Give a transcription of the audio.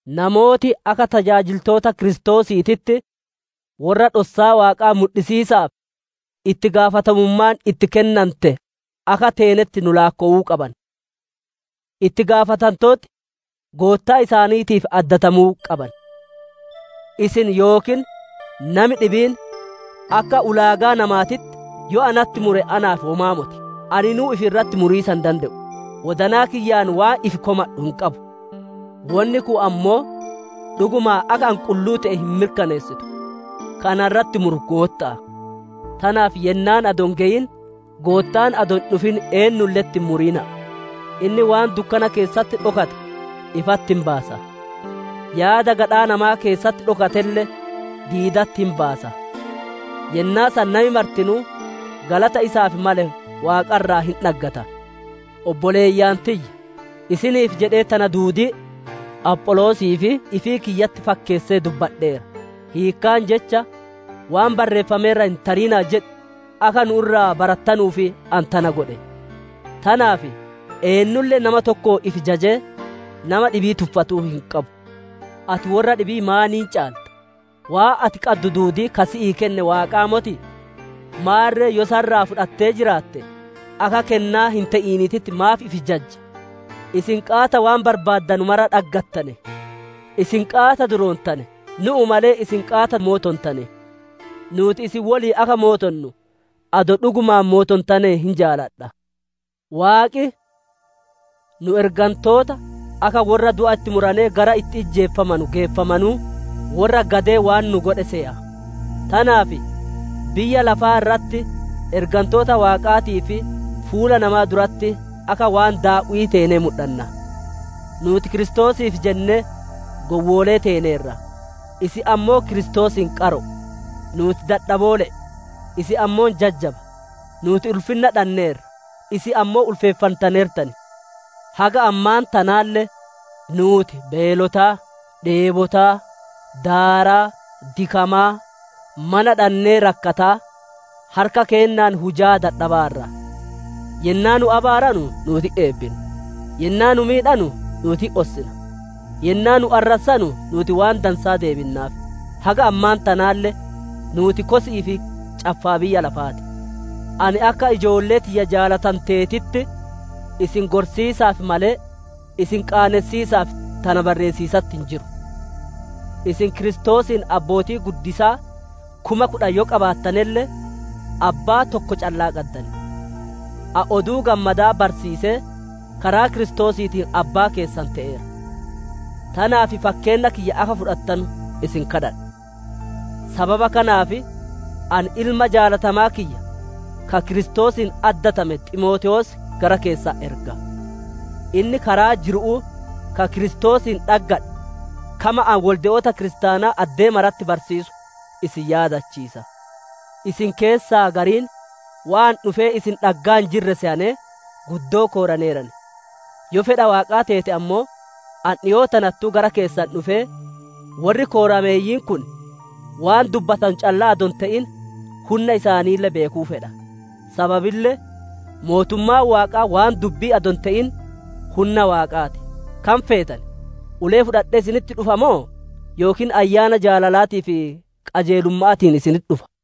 Namooti akka tajaajiltoota Kiristoosiititti worra dhossaa Waaqaa mudhisiisaaf itti gaafatamummaan itti kennante akka teenetti nu laakkowuu qaban. Itti gaafatantooti goottaa isaaniitiif addatamuu qaban. Isin yookiin nami dhibiin akka ulaagaa namaatitti yoo natti mure naaf womaa moti; aninuu ifi irratti muriisa hin dande'u. Wodanaa kiyyaan waan ifi komadhu hin qabu, wonni kun ammoo dhugumaan akka ani qulluu te'e hin mirkaneessitu. Ka na irratti muru Gootta'a. Tanaaf yennaan adoo hin geyin, Goottaan adoo hin dhufin eennulle'etti hin murina'a. Inni waan dukkana keessatti dhokate ifatti hin baasa; yaada gadhaa namaa keessatti dhokatelle diidatti hin baasa. Yennaa san nami martinuu galata isaaf male Waaqa irraa hin dhaggata. Obboleeyyan tiyya, isiniif jedhee tana duudii Apholoosii fi ifii kiyyatti fakkeessee dubbadheera. Hiikkaan Jecha, «Waan barreeffame irra hin tarina'a jedhu» akka nu'u irraa barattanuuf ani tana godhe. Tanaaf eennulle nama tokkoon ifi jajee, nama dhibii tuffatuu hin qabu. Ati worra dhibii maaniin caalta? Waan ati qaddu duudii ka si'ii kenne Waaqaa motii? Maarre yoo isa irraa fudhattee jiraatte, akka kennaa hin te'iniititti maaf ifi jajja? Isin qaata waan barbaaddanu mara dhaggattane! Isin qaata duroontane! Nu'u malee isin qaata mootontane. Nuuti isin woliin akka mootonnu, adoo dhugumaan mootontane hin jaaladha. Waaqi, nu'u ergantoota akka worra du'a itti muranee gara itti ijjeefamanu geeffamanuu, worra gadee waan nu godhe seya. Tanaaf biyya lafaa irratti ergantoota Waaqaatii fi fuula namaa duratti akka waan daaw'ii teenee mudhanna. Nuuti Kiristoosiif jennee gowwoolee teeneerra; isin ammoo Kiristoosiin qaro'o; nuuti dadhaboole'e, isin ammoo jajjaba. Nuuti ulfinna dhanneerra, isin ammoo ulfeeffantaneertan. Haga ammaan tanaalle nuuti beelotaa, dheebotaa, daaraa, dikamaa, mana dhannee rakkataa, harka keennaan hujaa dadhabaarra. Yennaa nu abaaranu, nuuti hin eebbinna; yennaa nu miidhanu, nuuti hin ossina; yennaa nu arrassanu, nuuti waan dansaa deebinnaaf. Haga ammaan tanaalle nuuti kosi'ii fi caffaa biyya lafa ti. Ani akka ijoollee tiyya jaalatanteetitti isin gorsiisaaf malee, isin qaanessiisaaf tana barreessiisatti hin jiru. Isin Kiristoosiin abbootii guddisaa kuma kudhan yoo qabaatanelle, Abbaa tokko callaa qaddan. Ani Oduu Gammadaa barsiisee karaa Kiristoosiitiin abbaa keessan te'eera. Tanaaf fakkeenna kiyya akka fudhattanu isin kadhadha. Sababa kanaaf ani ilma jaalatamaa kiyya, ka Kiristoosiin addatame Ximootewoos gara keessan erga. Inni karaa jiru'uu ka Kiristoosiin dhaggadhe, kama ani wolde'oota kiristaanaa addee maratti barsiisu isin yaadachiisa. Isin keessaa gariin waan ani dhufee isin dhaggaa hin jirre seyanee, guddoo kooraneeran. Yoo fedha Waaqaa teete ammoo, ani dhikoo tanattuu gara keessan dhufee, worri koorameeyyiin kun waan dubbatanu callaa adoo hin te'in hunna isaanille beekuu fedha. Sababille Mootummaan Waaqaa waan dubbi'ii adoo hin te'in hunna Waaqaa ti. Kam feetan? Ulee fudhadhee isinitti dhufa moo, yookiin ayyaana jaalalaatii fi qajeelumma'aatiin isinitti dhufa?